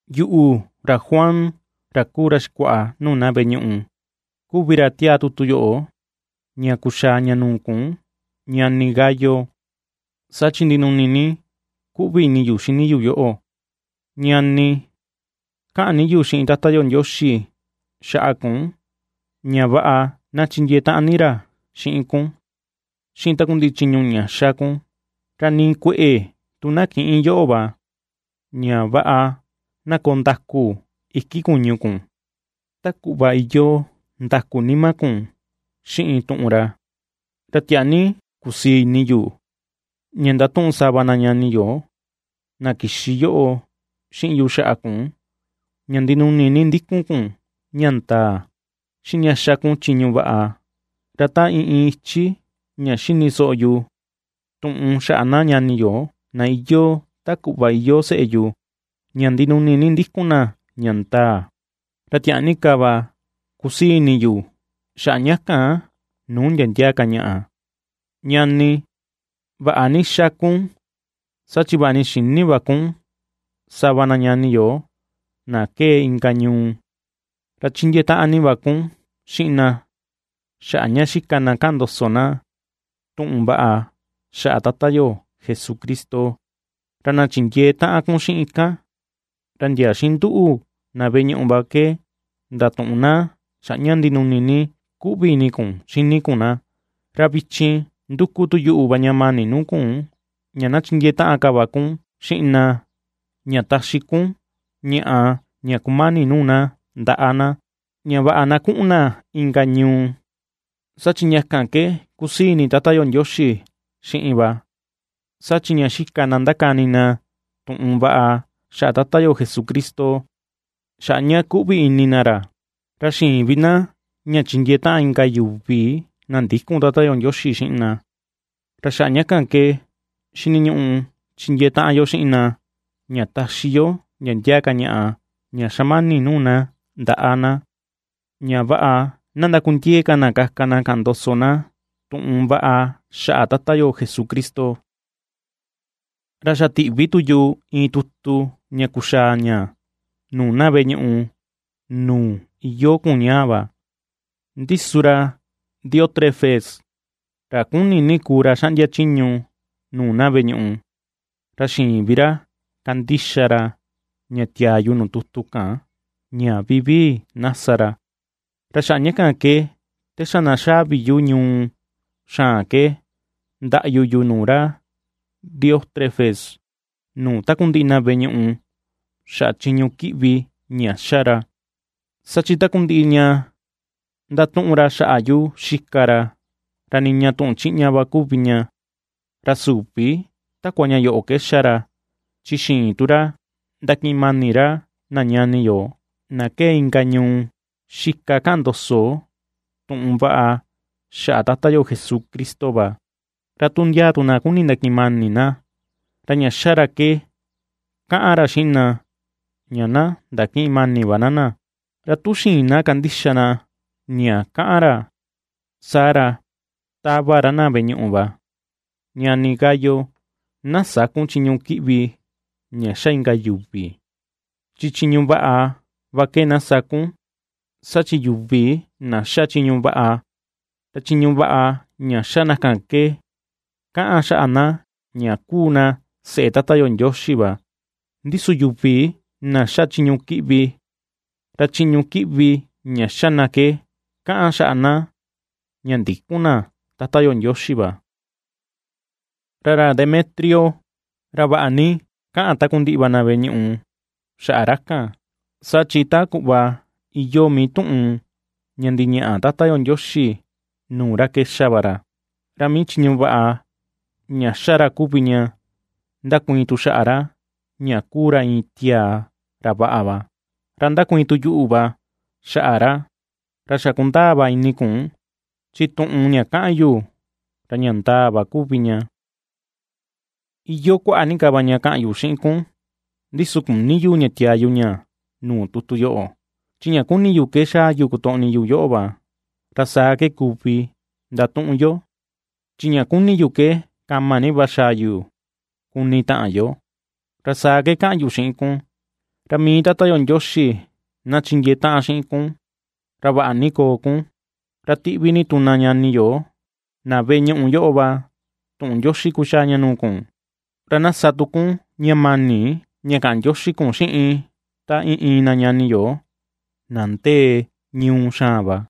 Yuꞌu, ra Juan, ra kuu ra xikuaꞌa nuu na veꞌe ñuꞌu kuvi ra tiaa tutu yoꞌo ña kuxaa ña nuu kun ñani Gayo, saa chi ndinuni ni kuꞌvi ini yu xini yu yoꞌo. Ñani, kaꞌan ni yu xiꞌin Tata yo Ndioxi xaꞌa kun ña vaꞌa na chindiee taꞌan ni ra xiꞌin kun xiꞌin takundiꞌi chiñu ña xa kun, ra nii kueꞌe tu na kïꞌin yoꞌo va, ña vaꞌa na koo ndaku iki kuñu kun ta kuꞌva iyoo ndaku nima kun xiꞌin tuꞌun ra. Ra tiaa ni kusii ini yu ña ndatuꞌun sava na ñani yo na kixi yoꞌo xiꞌin yu xaꞌa kun ña ndinuni ni ndikun kun ña ndaa, xiꞌin ña xa kun chiñu vaꞌa. Ra ta iin iin ichi ña xini soꞌo yu tuꞌun xaꞌa na ñani yu na iyoo ta kuꞌva iyoo seꞌe yu ña ndinuni ni ndikun na ña ndaa, ra tiaa ni ka va kusii ini yu xaꞌa ña kan nuu ndia ndia ka ñaꞌa. Ñani, vaꞌa ni va xa kun, saa chi vaꞌa ni xïni va kun sava na ñani yo na kee inka ñuu, ra chindiee taꞌan ni va kun xiꞌin na xaꞌa ña xika na kaꞌan ndoso na tuꞌun vaꞌa xaꞌa Tata yo Jesucristo. Ra na chindiee taꞌan kun xiꞌin kan, ra ndia xiꞌin nduꞌu na veꞌe ñuꞌu va ke ndatuꞌun na xaꞌa ña ndinuni ni kuꞌvi ini kun xini kun na. Ra vichin, nduku tu yuꞌu va ña mani nuu kun ña na chindiee taꞌan ka va kun xiꞌin na ña taxi kun ñaꞌa ña kumani nuu na ndaꞌa na, ña vaꞌa na kuꞌun na inka ñuu, saa chi ña kan ke kusii ini Tata yo Ndioxi xiꞌin va. Saa chi ña xika na ^ndakani na tuꞌun vaꞌa xaꞌa Tata yo Jesucristo, xaꞌa ña kuꞌvi ini na ra, ra xïin vi na ña chindiee taꞌan inka yuvi na ndïkun Tata yo Ndioxi xiꞌin na. Ra xaꞌa ña ke xiniñuꞌu chindiee taꞌan yo xiꞌin na ña taxi yo ndia ndia ka ñaꞌa ña xamani nuu na ndaꞌa na, ña vaꞌa na ndakundiee ka na kaka na kaꞌan ndoso na tuꞌun vaꞌa xaꞌa Tata yo Jesucristo. Ra xa tiꞌvi tu yu iin tutu ña kuxaa ña nuu na veꞌe ñuꞌu nuu iyoo kun ñaa va, ndi su ra Diótrefes, ra kuni ni kuu ra xaꞌndia chiñu nuu na veꞌe ñuꞌu, ra xïin vi ra kandixa ra ña tiaa yu nuu tutu kan ña vivii na sa ra. Ra xaꞌa ña kan ke, te xa na xaa vi yu ñuu xaan ke ndaꞌyu yu nuu ra Diótrefes nuu takundiꞌi na veꞌe ñuꞌu xaꞌa chiñu kiꞌvi ña ^xa ra, saa chi takundiꞌi ña ^ndatuꞌun ra xaꞌa yu xika ra, ra niña tuꞌun chiꞌña va kuvi ña. Ra süvi takua ña yoꞌo ke ^xa ra, chi xïin tu ra ndakiꞌin mani ra na ñani yo na kee inka ñuu xika kaꞌan ndoso tuꞌun vaꞌa xaꞌa Tata yo Jesucristo va, ra tu ndia tu na ^kuni ndakiꞌin mani na, ra ña ^xa ke kaꞌan ra xiꞌin na ña na ndakïꞌin mani va na na, ra tu xïin na kandixa na ña kaꞌan ra, saa ra ^tava ra na veꞌe ñuꞌu va. Ñani Gayo, na sä kun chiñu kiꞌvi ña ^xa inka yuvi, chi chiñu vaꞌa va ke na sa kun. Saa chi yuvi na ^xa chiñu vaꞌa, ra chiñu vaꞌa ña xa na ke ^kaꞌan xaꞌa na ña kuu na seꞌe Tata yo Ndioxi va; ndi su yuvi na ^xa chiñu kiꞌvi, ra chiñu kiꞌvi ña ^xa ke kaꞌan xaꞌa na ña ndïkun na Tata yo Ndioxi va. Ra ra Demetrio, ra vaꞌa ni kaꞌan takundiꞌi va na veꞌe ñuꞌu xaꞌa ra kan, saa chi ta kuꞌva iyoo mii tuꞌun ña ndiñaꞌa Tata yo Ndioxi nuu ra ke xa va ra, ra mii chiñu vaꞌa ña ^xa ra kuvi ña ^ndakuiin tu xaꞌa ra ña kuu ra iin tiaa ra vaꞌa va. Ra ndakuiin tu yuꞌu va xaꞌa ra, ra xa kundaa va ini kun, chi tuꞌun ña kaꞌan yu, ra ña ndaa va kuvi ña. Iyoo kuaꞌa ni ka va ña kaꞌan yu xiꞌin kun, ndi su küni yu ña tiaa yu ña nuu tutu yoꞌo; chi ña kuni yu ke xaa yu kotoꞌni yu yoꞌo va, ra saa ke kuvi ndatuꞌun yo. Chi ña kuni ni yu ke kama ni va xaa yu kuni taꞌan yo, ra saa ke kaꞌan yu xiꞌin kun. Ra mii Tata yo Ndioxi na chindiee taꞌan xiꞌin kun, ra vaꞌa ni koo kun. Ra tiꞌvi ni tu na ñani yo na veꞌe ñuꞌu yoꞌo va tuꞌun ndioxi kuxaa ña nuu kun; ra na sa tu kun ña mani ña kaꞌan ndioxi kun xiꞌin ta iin iin na ñani yo na ndee ñuu xaan va.